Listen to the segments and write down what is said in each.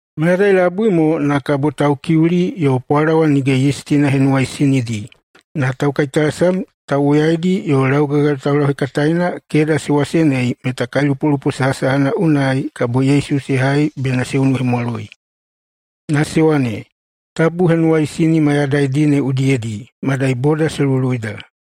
Mayadai labui mo na kabo Taukiuli yo Pwalawa Nige Yistina Henuwaisinidi, na taukaitalasam tauwoyaidi yo laugagayo taulauhekataena keda se wasenei meta kailupolupo sahasahana unai kabo Yesu se hai bena se unuhemwaloi. Na se wane, “Tabu henuwaisini mayadaidi ne udiyedi, madai boda se luluida.”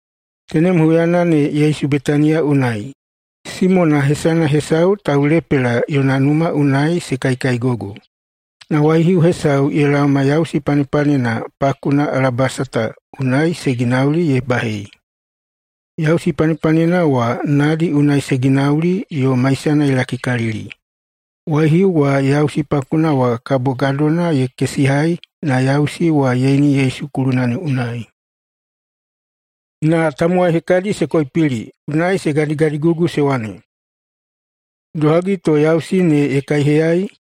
Tenem huyana ne Yesu Betaniya unai. Simona hesana hesau Taulepela yona numa unai se kaikaigogo. Na waihiu hesau ye laoma yausi panepanena pakuna alabasata unai se ginauli ye bahei. Yausi panepanena wa nadi unai se ginauli yo maisana ye lakikalili. Waihiu wa yausi pakuna wa kabo gadona ye kesihai na yausi wa ye ini Yesu kuluna unai. Na tamowai hekadi se koipili, unai se gadigadigugu se wane, “Idohagi to yausi ne ye kaiheyai?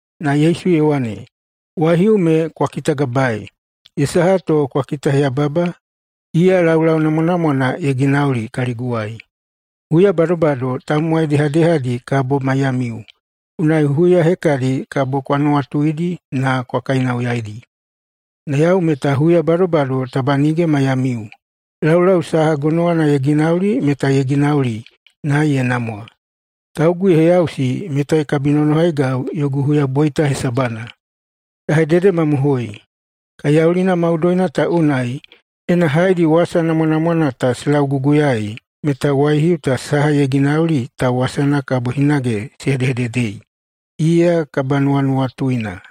Na Yesu ye wane, “Waihiu me kwa kitagabaei! Ye saha to kwa kitaheyababa? Iya laulau namwanamwana ye ginauli kaliguwai. Huya badobado tamowai dehadehadi kabo maiyamiu, unai huya hekadi kabo kwa nuwatuidi na kwa kainauyaidi. Na yau meta huya badobado taba nige maiyamiu. Laulau saha gonowana ye ginauli meta ye ginauli, na ye namwa. Taugu ye heyausi meta ye kabinonohaigau yogu huyaboita hesabana. Ya hededemamohoi: Kaiyaulina maudoina ta unai, ena haedi wasa namwanamwana ta se lauguguyaei, meta waihiu ta saha ye ginauli ta wasana kabo hinage se hedehededei, iya kabanuwanuwatuina.”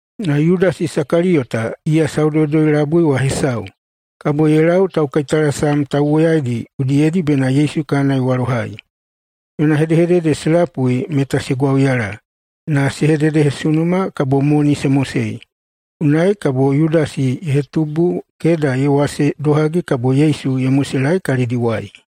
Na Yudasi Isakaliyota, iya Saudoudoi-labui wa hesau, kabo ye lau taukaitalasam tauwoyaidi udiyedi bena Yesu kana ye walohai. Yona hedehedede se lapui meta se gwauyala, na se hededehesunuma kabo moni se mosei. Unai kabo Yudasi ye hetubu keda ye wase idohagi kabo Yesu ye moselaei kalidiwai.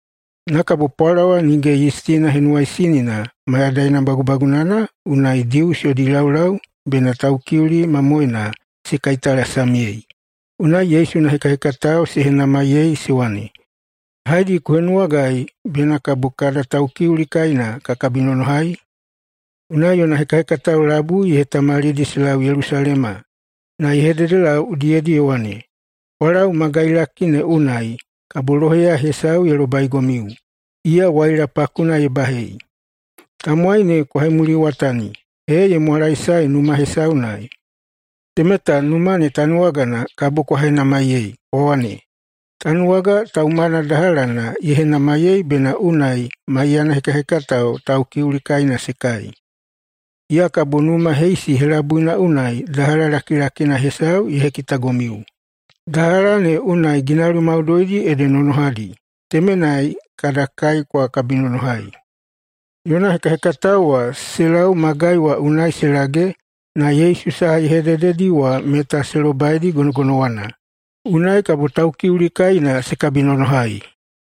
Na kabo Pwalawa Nige Yistina Henuwaisinina mayadaina bagubagunana unai Dius yodi laulau bena Taukiuli mamoena se kaitalasamyei, unai Yesu yona hekahekatao se henamaiyei se wane, “Haedi ku henuwagai bena kabo kada Taukiuli kaina ka kabinonohai?” Unai yona hekahekatao labui ye hetamalidi se lau Yelusalema, na ye hededelau udiyedi ye wane, “Kwa lau magailaki ne unai, kabo loheya hesau ye lobaigomiu, iya waila pakuna ye bahei. Tamowai ne kwa hemuliwatani ee ye mwalaesae numa hesau unai. Temeta numa ne tanuwagana kabo kwa henamaiyei kwa wane, ‘Tanuwaga taumana dahalana ye henamaiyei bena unai maiyana hekahekatao Taukiuli kaina se kai.’ Iya kabo numa heisi helabuina unai dahala lakilakina hesau ye hekitagomiu. Dahala ne unai ginauli maudoidi ede nonohadi. Temenai kada kai kwa kabinonohai.” Yona hekahekatao wa se lau magai wa unai se lage, na Yesu saha ye hedededi wa meta se lobaidi gonogonowana. Unai kabo Taukiuli kaina se kabinonohai.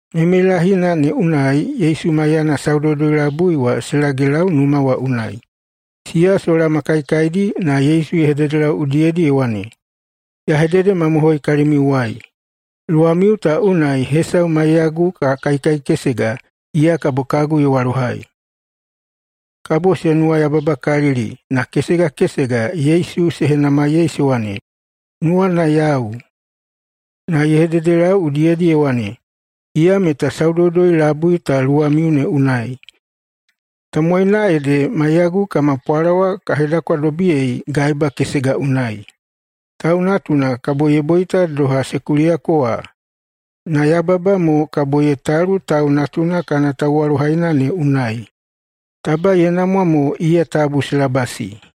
Meimeilahina ne unai Yesu maiyana Saudoudoi-labui wa se lagelau numa wa unai. Siya sola ma kaikaidi na Yesu ye hededelau udiyedi ye wane, “Ya hededemamohoi kalimiuwai: Luwamiu ta unai hesau maiyagu ka kaikaikesega, iya kabo kagu ye walohai.” Kabo se nuwayababakalili na kesega kesega Yesu se henamaiyei se wane, “Nuwana yau?” Na ye hededelau udiyedi ye wane, “Iya meta Saudoudoi-labui ta luwamiu ne unai. Tamowaina ede maiyagu kama pwalawa ka hedakwadobiyei gaeba kesega unai. Tau Natuna kabo ye boita doha se kuliyako wa. Na yababa mo kabo ye talu Tau Natuna kana tauwalohaina ne unai. Taba ye namwa mo iya tabu se labasi.”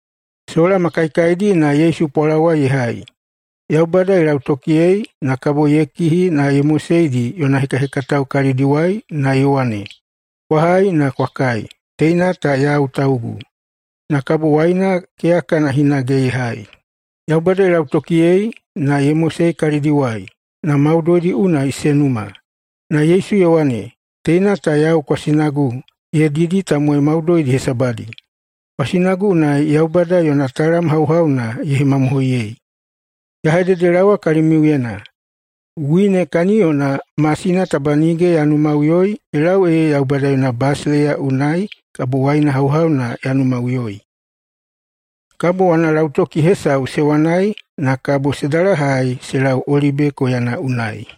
Sola ma kaikaidi na Yesu pwalawa ye hai, Yaubada ye lautokiyei, na kabo ye kihi na ye moseidi yona hekahekatao kalidiwai na ye wane, “Kwa hai na kwa kai! Teina ta yau taugu.” Na kabo waina keyakana hinage ye hai, Yaubada ye lautokiyei, na ye mosei kalidiwai. Na maudoidi unai se numa. Na Yesu ye wane, “Teina ta yau kwasinagu ye didi tamowai maudoidi hesabadi. Kwasinagu unai Yaubada yona talam hauhauna ye hemamohoiyei. Ya hededelaowa kalimiuyena: Wine kaniyona masina taba nige ya numaꞌuyoi ye lau ee Yaubada yona basileiya unai kabo waina hauhauna ya numaꞌuyoi.” Kabo wanalautoki hesau se wanai, na kabo se dalahai se lau Olibe koyana unai.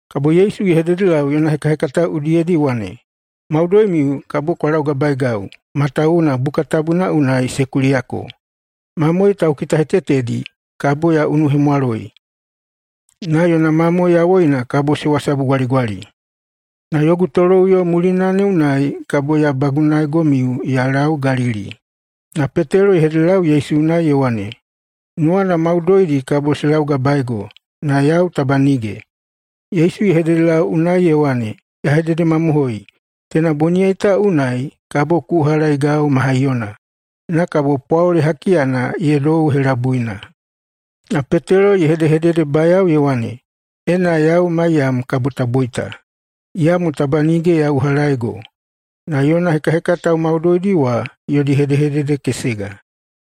Kabo Yesu ye hededelau yona hekahekatao udiyedi ye wane, “Maudoimiu kabo kwa laugabaegau, matawuwuna Buka Tabuna unai se kuliyako, ‘Mamoe taukitahetetedi kabo ya unuhemwaloi, na yona mamoe yawoina kabo se wasabugwaligwali.’ Na yogu toloꞌuyo mulina ne unai kabo ya bagunaegomiu ya lau Galili.” Na Petelo ye hededelau Yesu unai ye wane, “Nuwana maudoidi kabo se laugabaego, na yau taba nige.” Yesu ye hededelau unai ye wane, “Ya hededemamohoi: Teina boniyai ta unai kabo ku uhalaegau ma haiyona, na kabo pwaole hakiyana ye dou helabuina.” Na Petelo ye hedehededebayao ye wane, “Ena yau maiyam kabo ta boita, iyamo taba nige ya uhalaego.” Na yona hekahekatao maudoidi wa yodi hedehedede kesega.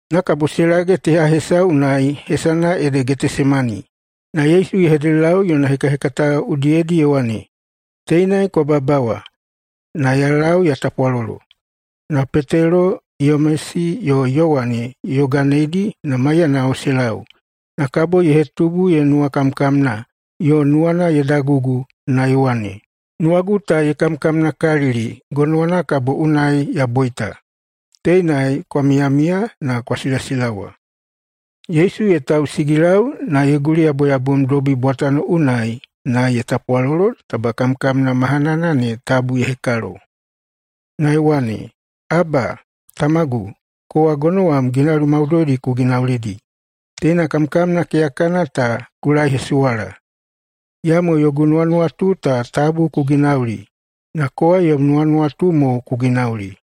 Na kabo se lage teha hesau unai hesana ede Getesemani, na Yesu ye hededelau yona hekahekatao udiyedi ye wane, “Teinai kwa babawa, na ya lau ya tapwalolo.” Na Petelo, Yamesi yo Yowane ye yoganeidi na maiyanao se lau, na kabo ye hetubu ye nuwakamkamna yo nuwana ye dagugu na ye wane, “Nuwagu ta ye kamkamnakalili gonowana kabo unai ya boita. Teinai kwa miyamiya na kwa silasilawa!” Yesu ye tausigilau na ye guliyaboyabomdobi bwatano unai na ye tapwalolo taba kamkamna mahanana ne tabu ye hekalo. Na ye wane, “Aba, Tamagu, kowa gonowam ginauli maudoidi ku ginaulidi. Teina kamkamna keyakana ta ku laehesuwala. Iyamo yogu nuwanuwatu ta tabu ku ginauli, na kowa yom nuwanuwatu mo ku ginauli.”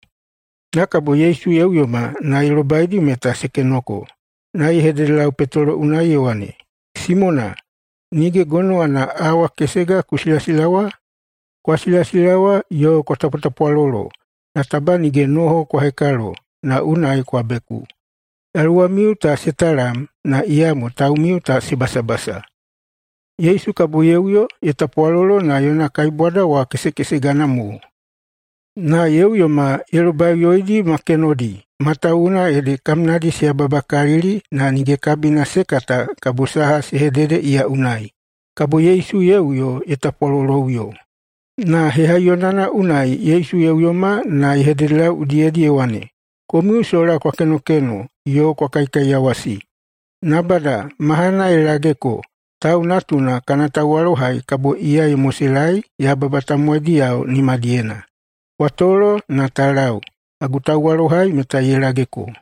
Na kabo Yesu ye uyoma na ye lobaidi meta se kenoko. Na ye hededelau Petelo unai ye wane, “Simona, nige gonowana awa kesega ku silasilawa? Kwa silasilawa yo kwa tapwatapwalolo, na taba nige noho kwa hekalo na unai kwa beku. Yaluwamiu ta se talam, na iyamo taumiu ta se basabasa.” Yesu kabo ye uyo ye tapwalolo na yona kaibwada wa kesekesegana mo. Na ye uyoma ye lobaiꞌuyoidi ma kenodi, matawuwuna ede kamnadi se yababakalili na nige kabina se kata kabo saha se hedede iya unai. [Kabo Yesu ye uyo ye tapwaloloꞌuyo.] Na hehaiyonana unai Yesu ye uyoma na ye hededelau udiyedi ye wane, “Komiu sola kwa kenokeno yo kwa kaikaiyawasi? Nabada! Mahana ye lageko! Tau Natuna kana tauwalohai kabo iya ye moselaei yababa tamowaidiyao nimadiyena. Kwa tolo na ta lau! Kagu tauwalohai meta ye lageko.”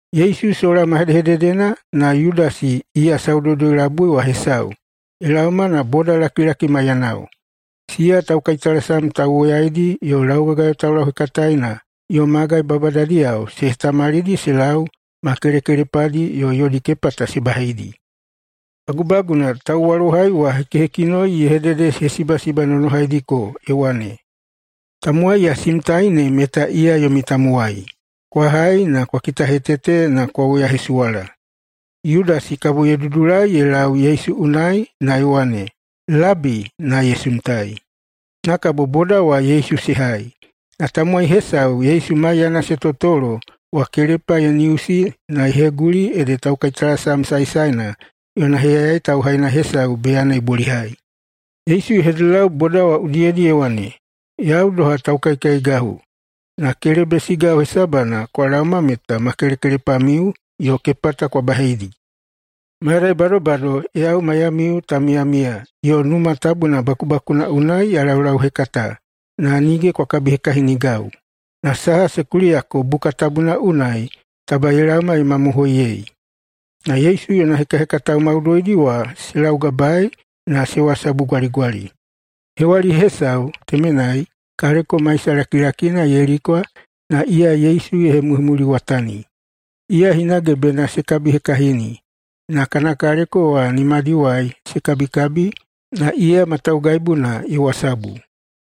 Yesu sola ma hedehededena, na Yudasi, iya Saudoudoi-labui wa hesau, ye laoma na bodalakilaki maiyanao. Siya taukaitalasam tauwoyaidi yo laugagayo taulauhekataena yo magai babadadiyao se hetamalidi se lau ma kelekelepadi yo yodi kepata se baheidi. Bagubaguna, tauwalohai wa hekihekinoi ye hededehesibasibanonohaidiko ye wane, “Tamowai ya simtai ne meta iya yomi tamowai. Kwa hai na kwa kitahetete na kwa woyahesuwala.” Yudasi kabo ye dudulai ye lau Yesu unai na ye wane, “Labi!”, na ye simtai. Na kabo boda wa Yesu se hai. Na tamowai hesau Yesu maiyana se totolo wa kelepa ye niusi na ye heguli ede taukaitalasam saesaena yona heyayai tauhaina hesau beyana ye bolihai. Yesu ye hededelau boda wa udiyedi ye wane, “Yau doha taukaikaigahu, na kelebesigau hesabana kwa laoma meta ma kelekelepamiu yo kepata kwa baheidi? Mayadai badobado yau maiyamiu ta miyamiya yo Numa Tabuna bakubakuna unai ya laulauhekata, na nige kwa kabihekahinigau. Na saha se kuliyako Buka Tabuna unai, taba ye laoma ye hemamohoiyei.” Na Yesu yona hekahekatao maudoidi wa se laugabaei na se wasabugwaligwali. Hewali hesau temenai, kaleko maisa lakilakina ye likwa na iya Yesu ye hemuhemuliwatani. Iya hinage bena se kabihekahini, na kana kaleko wa nimadiwai se kabikabi, na iya ma taugaibuna ye wasabu.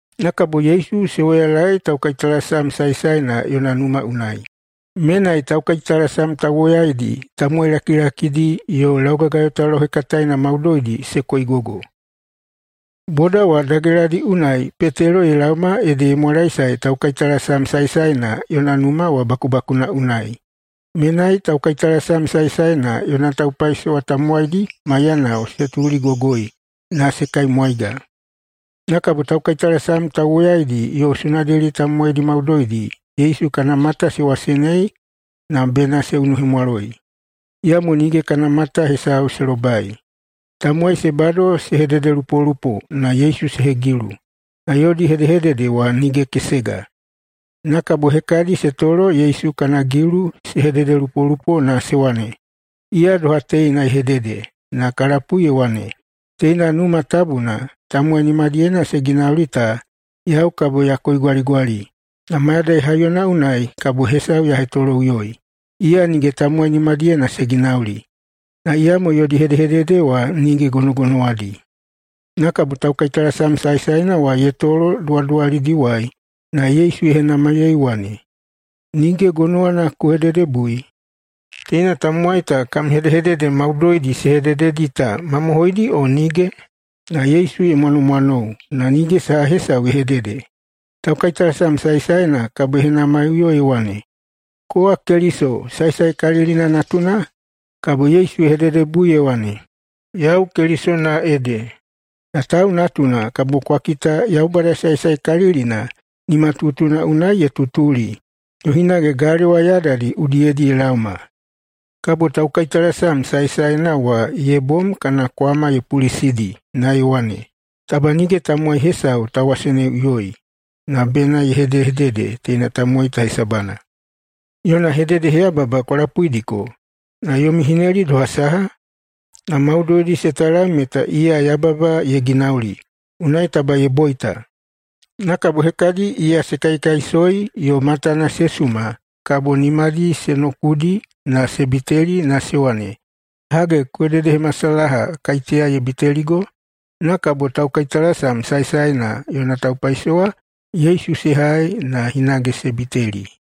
Na kabo Yesu se woyalaei taukaitalasam saesaena yona numa unai. Menai taukaitalasam tauwoyaidi, tamowai lakilakidi yo laugagayo taulauhekataena maudoidi se koigogo. Boda wa dageladi unai Petelo ye laoma ede ye mwalaesae taukaitalasam saesaena yona numa wa bakubakuna unai. Menai taukaitalasam saesaena yona taupaisowa tamowaidi maiyanao se tuligogoi na se kaimwaiga. Na kabo taukaitalasam tauwoyaidi yo Sunedeli tamowaidi maudoidi Yesu kana mata se wasenei na bena se unuhemwaloi. Iyamo nige kana mata saha hesau se lobai. Tamowai se bado se hededelupolupo na Yesu se hegilu, na yodi hedehedede wa nige kesega. Na kabo hekadi se tolo Yesu kana gilu se hededelupolupo na se wane, “Iya doha teina ye hedede na ka lapui ye wane, ‘Teina Numa Tabuna tamowai nimadiyena se ginauli ta, yau kabo ya koigwaligwali, na mayadai haiyona unai kabo hesau ya hetoloꞌuyoi, iya nige tamowai nimadiyena se ginauli.’” Na iyamo yodi hedehedede wa nige gonogonowadi. Na kabo taukaitalasam saesaena wa ye tolo duwaduwalidiwai na Yesu ye henamaiyei ye wane, “Nige gonowana ku hededebui? Teina tamowai ta kam hedehedede maudoidi se hedededi ta mamohoidi o nige?” Na Yesu ye mwanomwanou na nige saha hesau ye hedede. Taukaitalasam saesaena kabo ye henamaiꞌuyo ye wane, “Kowa Keliso, Saesaekalilina natuna?” Kabo Yesu ye hededebui ye wane, “Yau Kelisona ede. Na Tau Natuna kabo kwa kita Yaubada Saesaekalilina nimatutuna unai ye tutuli yo hinage galewa yadadi udiyedi ye laoma.” Kabo taukaitalasam saesaena wa ye bom kana kwama ye pulisidi na ye wane, “Taba nige tamowai hesau ta waseneiꞌuyoi na bena ye hedehedede teina tamowai ta hesabana! Yona hededeheyababa kwa lapuidiko. Na yomi hineli doha saha?” Na maudoidi se talam meta iya yababa ye ginauli, unai taba ye boita. Na kabo hekadi iya se kaikaisoi yo matana se suma kabo nimadi se nokudi na se biteli na se wane, “Hage, ku hededehemasalaha [kaiteya ye biteligo]?” Na kabo taukaitalasam saesaena yona taupaisowa Yesu se hai na hinage se biteli.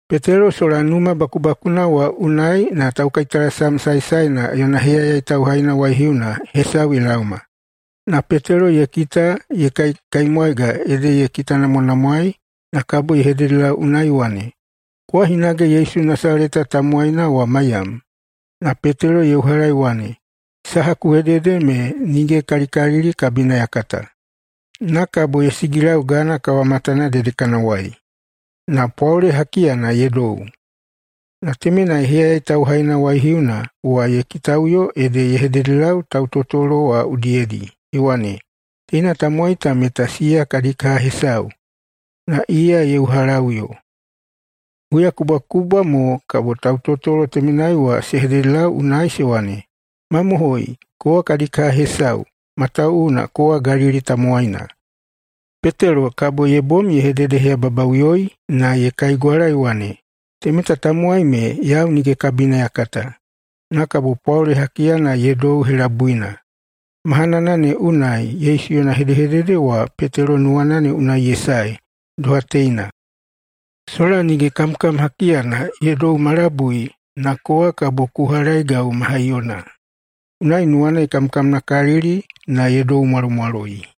Petelo sola numa bakubakuna wa unai na taukaitalasam saesaena yona heyayai tauhaina waihiuna hesau ye laoma. Na Petelo ye kita ye kaikaimwaiga ede ye kitanamwanamwaei na kabo ye hededelau unai ye wane, “Kowa hinage Yesu Nasaleta tamowaina wa maiyam.” Na Petelo ye uhala ye wane, “Saha ku hedehedede me nige kalikalili kabina ya kata.” Na kabo ye sigilau gana kawamatana dedekanawai. Na pwaole hakiyana ye dou. Na temenai heyayai tauhaina waihiuna wa ye kitaꞌuyoi ede ye hededelau tautotolo wa udiyedi ye wane, “Teina tamowai ta meta siya kadi kaha hesau.” Na iya ye uhalaꞌuyo. Huyakubwakubwa mo kabo tautotolo temenai wa se hededelau unai se wane, “Mamohoi, kowa kadi kaha hesau, matawuwuna kowa Galili tamowaina.” Petelo kabo ye bom ye hededeheyababaꞌuyoi na ye kaigwala ye wane, “Temeta tamowai me yau nige kabina ya kata.” Na kabo pwaole hakiyana ye dou helabuina. Mahanana ne unai Yesu yona hedehedede wa Petelo nuwana ne unai ye sae, doha teina, “Sola nige kamkam hakiyana ye dou ma labui, na kowa kabo ku uhalaeigau ma haiyona.” Unai nuwana ye kamkamnakalili na ye doumwalomwaloi.